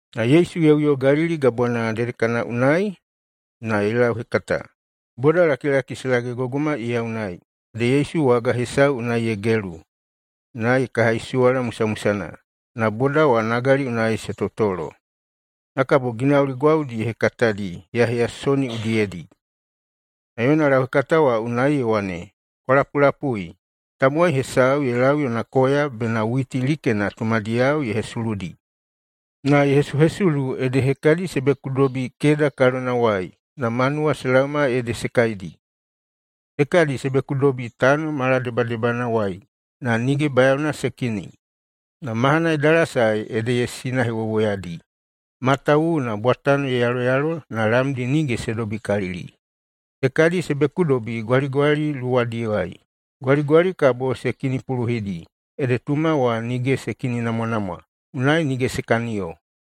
Na Yesu ye uyo Galili Gabwana dedekana unai na ye lauhekata. Bodalakilaki se lagegogoma iya unai, ede Yesu waga hesau unai ye gelu, na ye kahaisuwala musamusana, na boda wa nagali unai se totolo. Na kabo ginauli gwaudi ye hekatadi heyaheyasoni udiyedi. Yona lauhekata wa unai ye wane, “Kwa lapulapui! Tamowai hesau ye lau yona koya, bena witi likena tumadiyao ye hesuludi. Na ye hesuhesulu ede hekadi se bekudobi keda kalonawai, na manuwa se laoma ede se kaidi. Hekadi se bekudobi tano maladebadebanawai na nige bayaona se kini. Na mahana ye dalasae ede ye sinahewowoyadi, matawuwuna bwatano ye yaloyalo na lamdi nige se dobikalili. Hekadi se bekudobi gwaligwali luwadiwai. Gwaligwali kabo se kinipuluhidi, ede tuma wa nige se kininamwanamwa, unai nige se kaniyo.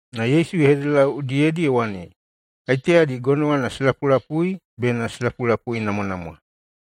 Na Yesu ye hededelau udiyedi ye wane, “Kaiteyadi gonowana se lapulapui bena se lapulapuinamwanamwa!”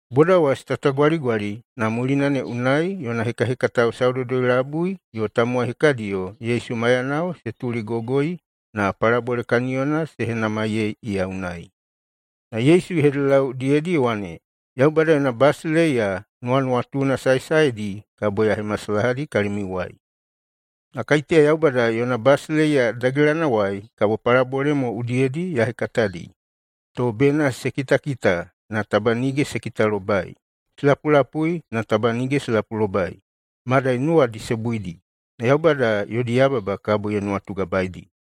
Boda wa se tatagwaligwali, na mulina ne unai yona hekahekatao saudoudoi-labui yo tamowai hekadiyo Yesu maiyanao se tuligogoi, na palabole kaniyona se henamaiyei iya unai. Na Yesu ye hededelau udiyedi ye wane, “Yaubada yona basileiya nuwanuwatuna saesaedi kabo ya hemasalahadi kalimiuwai. Na kaiteya Yaubada yona basileiya dagelanawai, kabo palabole mo udiyedi ya hekatadi, to bena ‘se kitakita, na taba nige se kitalobai, se lapulapui, na taba nige se lapulobai, madai nuwadi se buidi, na Yaubada yodi yababa kabo ye nuwatugabaeidi.’”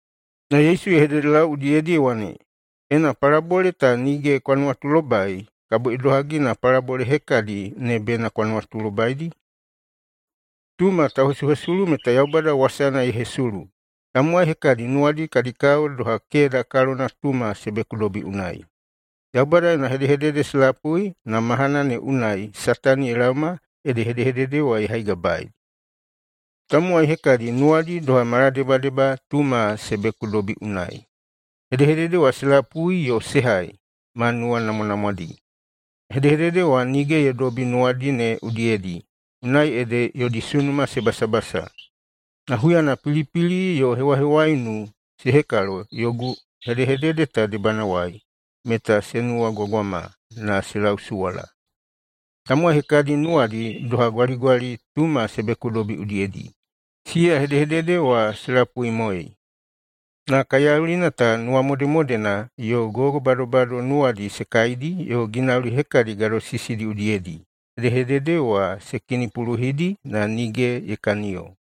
Na Yesu ye hededelau udiyedi ye wane, “Ena palabole ta nige kwa nuwatulobai, kabo idohagi na palabole hekadi ne bena kwa nuwatulobaidi? Tuma tauhesuhesulu meta Yaubada wasana ye hesulu. Tamowai hekadi nuwadi kadi kao doha keda kalona tuma se bekudobi unai. Yaubada yona hedehedede se lapui, na mahanana ne unai Satani ye laoma ede hedehedede wa ye haigabaei. Tamowai hekadi nuwadi doha maladebadeba tuma se bekudobi unai. Hedehedede wa se lapui yo se hai ma nuwanamwanamwadi. Na hedehedede wa nige ye dobi nuwadi ne udiyedi, unai ede yodi sunuma se basabasa. Na huyana pilipili yo hewahewaiunu se hekalo yogu hedehedede ta debanawai, meta se nuwagwagwama na se lausuwala. Tamowai hekadi nuwadi doha gwaligwali tuma se bekudobi udiyedi. Siya hedehedede wa se lapuimoei. Na kaiyaulina ta nuwamodemodena yo gogobadobado nuwadi se kaidi yo ginauli hekadi gadosisidi udiyedi hedehedede wa se kinipuluhidi na nige ye kaniyo.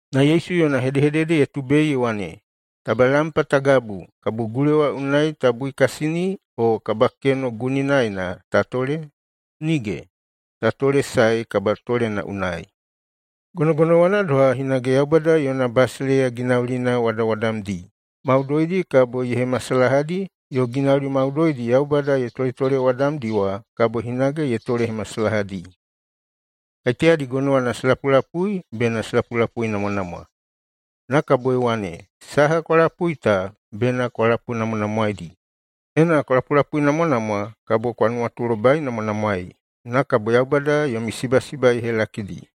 Na Yesu yona hedehedede ye tubei ye wane, “Taba lampa ta gabu, kabo gulewa unai ta buikasini o kabakeno guninaena ta tole? Nige! Ta tolesae kabatolena unai. Gonogonowana doha hinage Yaubada yona basileiya ginaulina wadawadamdi maudoidi kabo ye hemasalahadi, yo ginauli maudoidi Yaubada ye toletolewadamdi wa kabo hinage ye tolehemasalahadi. Kaiteyadi gonowana se lapulapui bena se lapulapuinamwanamwa!” Na kabo ye wane, “Saha kwa lapui ta bena kwa lapunamwanamwaeidi. Ena kwa lapulapuinamwanamwa, kabo kwa nuwatulobainamwanamwaei. Na kabo Yaubada yomi sibasiba ye helakidi.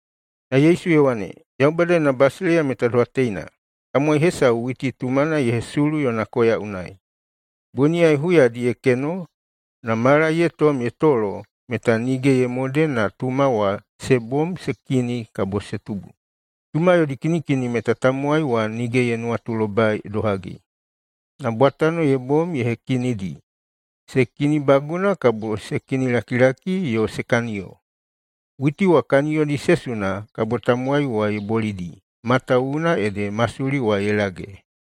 Na Yesu ye wane, “Yaubada yona basileiya meta doha teina: Tamowai hesau witi tumana ye hesulu yona koya unai. Boniyai huyadi ye keno, na mala ye tom ye tolo, meta nige ye mode na tuma wa se bom se kini kabo se tubu. Tuma yodi kinikini meta tamowai wa nige ye nuwatulobai idohagi. Na bwatano ye bom ye hekinidi: se kinibaguna, kabo se kinilakilaki yo se kaniyo. Witi wa kaniyodi se suna, kabo tamowai wa ye bolidi, matawuwuna ede masuli wa ye lage.”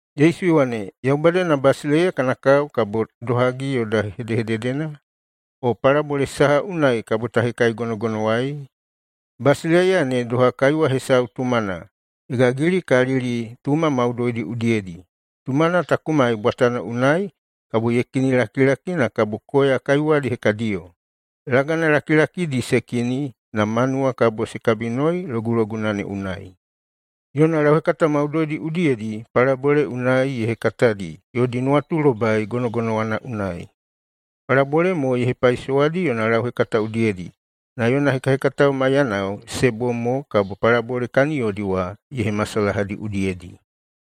Yesu ye wane, “Yaubada yona basileiya kana kao kabo idohagi yoda hedehededena? O palabole saha unai kabo ta hekaigonogonowaei? Basileiya ne doha kaiwa hesau tumana ye gagilikalili tuma maudoidi udiyedi. Tumana ta kumai bwatano unai, kabo ye kinilakilaki na kabo koya kaiwadi hekadiyo. Lagana lakilakidi se kini, na manuwa kabo se kabinoi loguloguna ne unai.” Yona lauhekata maudoidi udiyedi palabole unai ye hekatadi yodi nuwatulobai gonogonowana unai. Palabole mo ye hepaisowadi yona lauhekata udiyedi. Na yona hekahekatao maiyanao se bom mo, kabo palabole kaniyodi wa ye hemasalahadi udiyedi.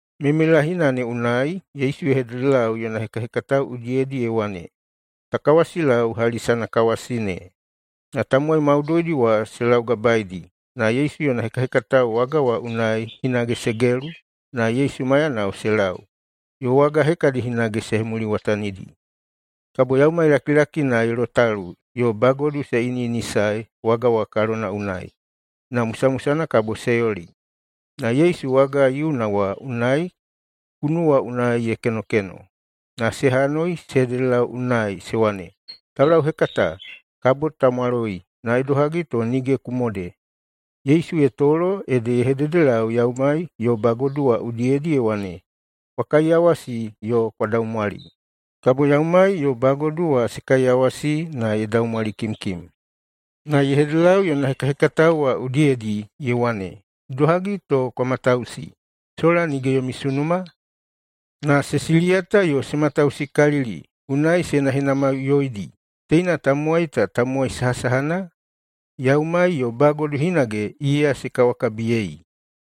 Meimeilahina ne unai, Yesu ye hededelau yona hekahekatao udiyedi ye wane, “Ta kawasilau hali sanakawasi ne.” Na tamowai maudoidi wa se laugabaeidi, na Yesu yona hekahekatao waga wa unai hinage se gelu na Yesu maiyanao se lau, yo waga hekadi hinage se hemuliwatanidi. Kabo yaumai lakilakina ye lotalu yo bagodu se iniꞌinisae waga wa kalona unai, na musamusana kabo se yoli. Na Yesu waga yiuna wa unai kunuwa unai ye kenokeno. Na se hanoi se hededelau unai se wane, “Taulauhekata, kabo ta mwaloi, na idohagi to nige ku mode?” Yesu ye tolo ede ye hededelau yaumai yo bagodu wa udiyedi ye wane, “Kwa kaiyawasi yo kwa daumwali!” Kabo yaumai yo bagodu wa se kaiyawasi na ye daumwalikimkim. Na ye hededelau yona hekahekatao wa udiyedi ye wane, “Idohagi to kwa matausi? Sola nige yomi sunuma?” Na se siliyata yo se matausikalili, unai se henahenamaiꞌuyoidi, “Teina tamowai ta tamowai sahasahana? Yaumai yo bagodu hinage iya se kawakabiyei!”